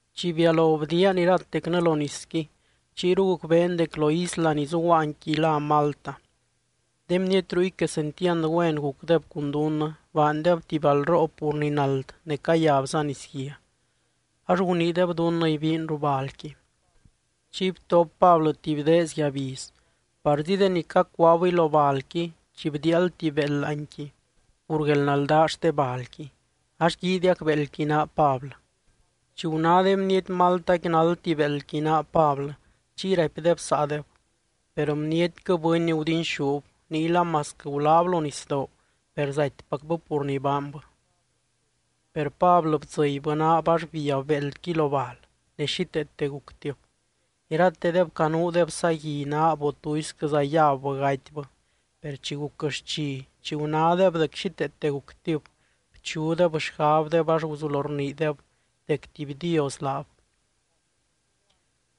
Chi bialo bdiian iratecnɨ lo nisqui, chiyru gucbeen dec lo isla ni zuguaanqui lá Malta. De bniety ruy quesentiand güen gucdeb cun dunnɨ. Baandeb tuby balroo pur ni nald ne cayabza nisguia, ax guniideb dunnɨ ibiin ruu balqui. Chiy btop Pablɨ tuby deez yabiz, parzi deni cacuaabɨy lo balqui chi bdiiald tuby béeld láanqui pur guelnaldaa xte balqui, ax guiidiac béeldqui naa Pablɨ. Chi guná de bniety Maltaqui náldti béeldqui naa Pablɨ, chiy raipdeb saadeb: —Per bnietquɨ bɨny gudinxúb, niyla masquɨ guláb lo nisdoo, per zatypacbɨ pur ni baanbɨ. Per Pablɨ bdzɨbybɨ naab ax biab béeldqui lo bal, ne xíteete guctib. Iratedeb canuudeb sagui naab, o tuisquɨza yabbɨ gatybɨ. Per chi guc xchi, chi gunádeb dec xíteete guctib, bchudeb xgabdeb ax guzulo rniideb dec tuby dios laab.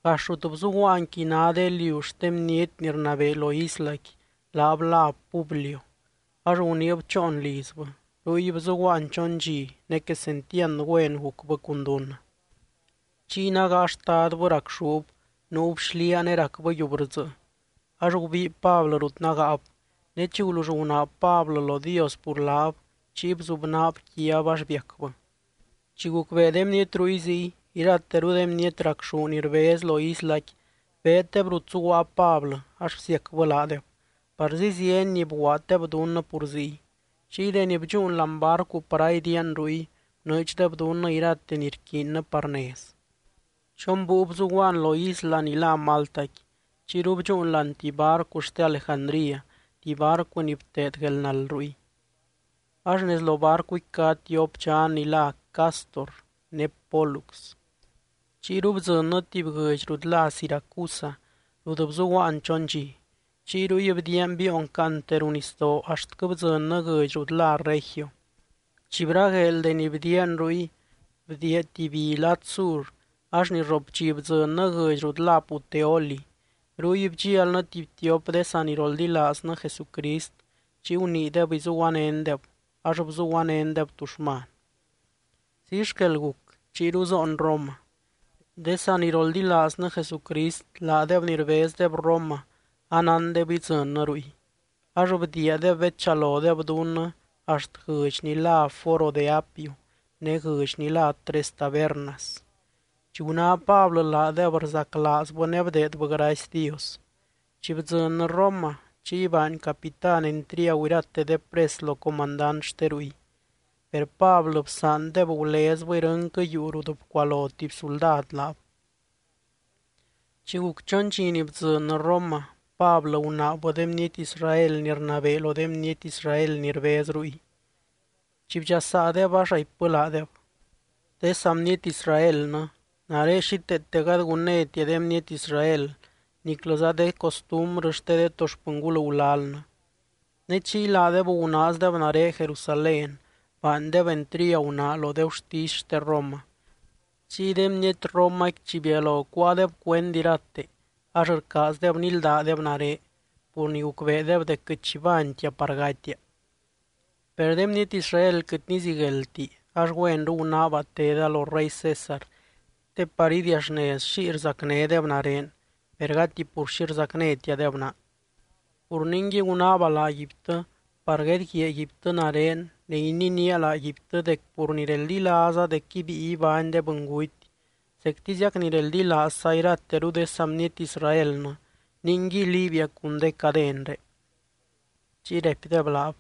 Gax rut bzuguaanqui ná de liu xte bniety ni rnabee lo islaqui, laab láb Publio. Ax guniib choon lizbɨ, ruy bzuguaan chon dxi, ne quesentiand güen gucbɨ cun dunnɨ. Chiy nágaa xtadbɨ racxúb, nuub xliaa ne racbɨ yiubrdzɨɨ. Ax gubii Pablɨ rut nágaab, ne chi gulull gunaab Pablɨ lo Dios pur laab, chiy bzubnaab quiab ax biacbɨ. Chi gucbee de bniety ruy ziy, irateru de bniety racxú ni rbez lo islaqui beeddeb rut zuguaa Pablɨ ax bsiacbɨ laadeb. Parzi zieny ni bguaaddeb dunnɨ pur ziy. Chiy deni bdxúun láani barcu par aidiian ruy, bnɨɨdxdeb dunnɨ irate ni rquiinnɨ par nez. Chon búiu bzuguaan lo isla ni lá Maltaqui, chiyru bdxúun láani tuby barcu xte Alejandría, tuby barcu ni bteed guelnald ruy. Ax nez lo barcuqui cá tiop dxan ni lá Cástor ne Pólux. Chiyru bdzɨnnɨ tuby guɨdx rut lá Siracusa, rut bzuguaan chon dxi. Chiy ruy bdiian biion caante ruu nisdoo axtquɨ bdzɨnnɨ guɨdx rut lá Regio. Chi bragueel deni bdiian ruy, bdiia tuby bi lad sur ax ni rrop dxi bdzɨnnɨ guɨdx rut lá Puteoli. Ruy bdxialnɨ tuby tiop de saniroldilaaznɨ Jesucrist, chiy guniideb izuguanéndeb, ax bzuguanéndeb tuxman. Ziy xquel guc, chiyru zoon Roma. De saniroldilaaznɨ Jesucrist, laadeb ni rbezdeb Roma, anándeb idzɨnnɨ ruy. Ax bdiiadeb bedchalodeb dunnɨ axt guɨdx ni lá Foro de Apio ne guɨdx ni lá Tres Tabernas. Chi guná Pablɨ laadeb rzaclaazbɨ ne bdeedbɨ gracy Dios. Chi bdzɨnnɨ Roma, chiy baany capitán entriagu irate de pres lo comandant xte ruy. Per Pablɨ bsaandeb gulezbɨ irɨnquɨ yuu rut bcualo tuby suldad laab. Chi guc chon dxi ni bdzɨnnɨ Roma, Pablɨ gunaabbɨ de bniety Israel ni rnabee lo de bniety Israel ni rbez ruy. Chi bdxasaadeb, ax raipbɨ laadeb: —De saa bniety Israelnɨ, nare xíteete gady gunnétia de bniety Israel niclɨza de costumbrɨ xte de to xpɨngul gulalnɨ. Ne chiy laadeb gunaazdeb nare Jerusalén, baandeb entriagu naa lo de gurtisy xte Roma. Chiy de bniety Romaqui chi bialo cuáadeb cuend irate, ax rcaazdeb níldadeb nare pur ni gucbeedeb dec quɨt xi baantia par gatia. Per de bniety Israel quɨt nizigueldti, ax güenru gunaaba teda lo rey César te par idiaxnez xiy rzacnédeb nare, per gati pur xi rzacnétiadeb naa. Pur ningui gunaaba laaguibtɨ, par guedguiaaguibtɨ nare ne ininía laaguibtɨ dec pur ni reldilaaza dec ibíi ibány de bɨnguty zectiziac ni reldilaazza irateru de saa bniety Israelnɨ, ninguiy liibia cun de cadenré. Chiy raipdeb laab: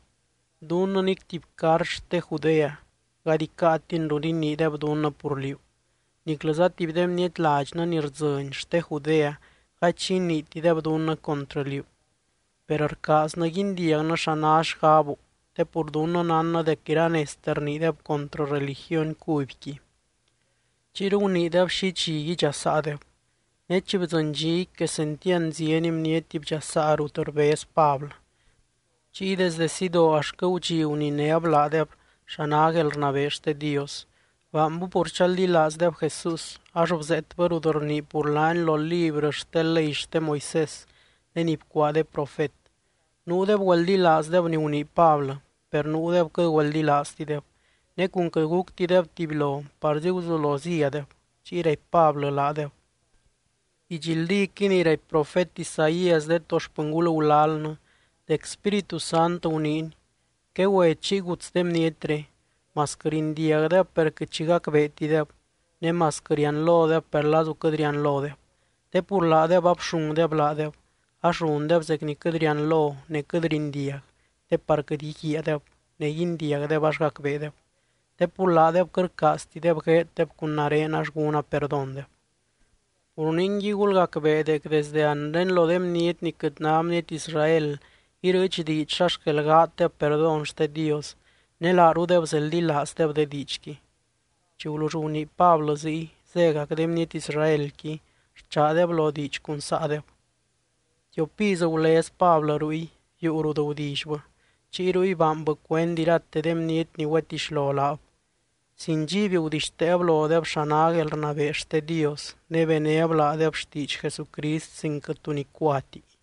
—Dunnɨ nic tuby cart xte Judea gady icáatin rut iniideb dunnɨ pur liú, niclɨza tuby de bniety ladxnɨ ni rdzɨny xte Judea gady xi iniitideb dunnɨ contrɨ liú. Per rcaaznɨ guindiagnɨ xa ná xgabu, te pur dunnɨ nánnɨ dec iranezte rniideb contrɨ religiony cubyqui. Chiyru guniideb xi dxi idxasaadeb. Ne chi bdzɨny dxiqui, quesentiand zieny bniety bdxasaa rut rbez Pablɨ. Chiy desde sidoo axtquɨ gudxi guninéb laadeb xa ná guelrnabee xte Dios. Baanbɨ pur chaldilaazdeb Jesús, ax bzeetbɨ rut rnii pur laany lo librɨ xte ley xte Moisés ne ni bcuaa de profet. Nuudeb güeldilaazdeb ni gunii Pablɨ, per nuudeb quɨt güeldilaaztideb. Ne cun quɨt guctideb tubylo, parzi guzulo zíadeb. Chiy raipy Pablɨ laadeb: —Didxldíquɨy ni raipy profet Isaías de to xpɨngul gulalnɨ dec Spíritu Sant guniiny: Quegüe chiy guts de bnietre: Masquɨ rindiagdeb per quɨt xi gacbeetideb, ne masquɨ rianlodeb per lazu quɨt rianlodeb. Te pur laadeb abxungdeb laadeb, ax rundeb zec ni quɨt rianlo ne quɨt rindiag te par quɨt íguiaadeb ne guindiagdeb ax gacbeedeb. Te pur laadeb quɨt rcaaztideb gueeddeb cun nare, ax gúna perdóndeb. Pur ningui gulgacbee dec desde anre lo de bniety ni quɨt náti bniety Israel irɨɨch diidx xa xquel gaaddeb perdón xte Dios, ne laarudeb zeldilaazdeb de diidxqui. Chi gulull gunii Pablɨ ziy, zégac de bniety Israelqui rchaadeb lo diidx cun saadeb. Tiop iz gulez Pablɨ ruy, yuu rut gudillybɨ. Chiy ruy baanbɨ cuend irate de bniety ni güetixlo laab. Sin dxiby gudixteeb lodeb xa ná guelrnabee xte Dios, ne benéb laadeb xtiidx Jesucrist sin quɨt tu nicuati.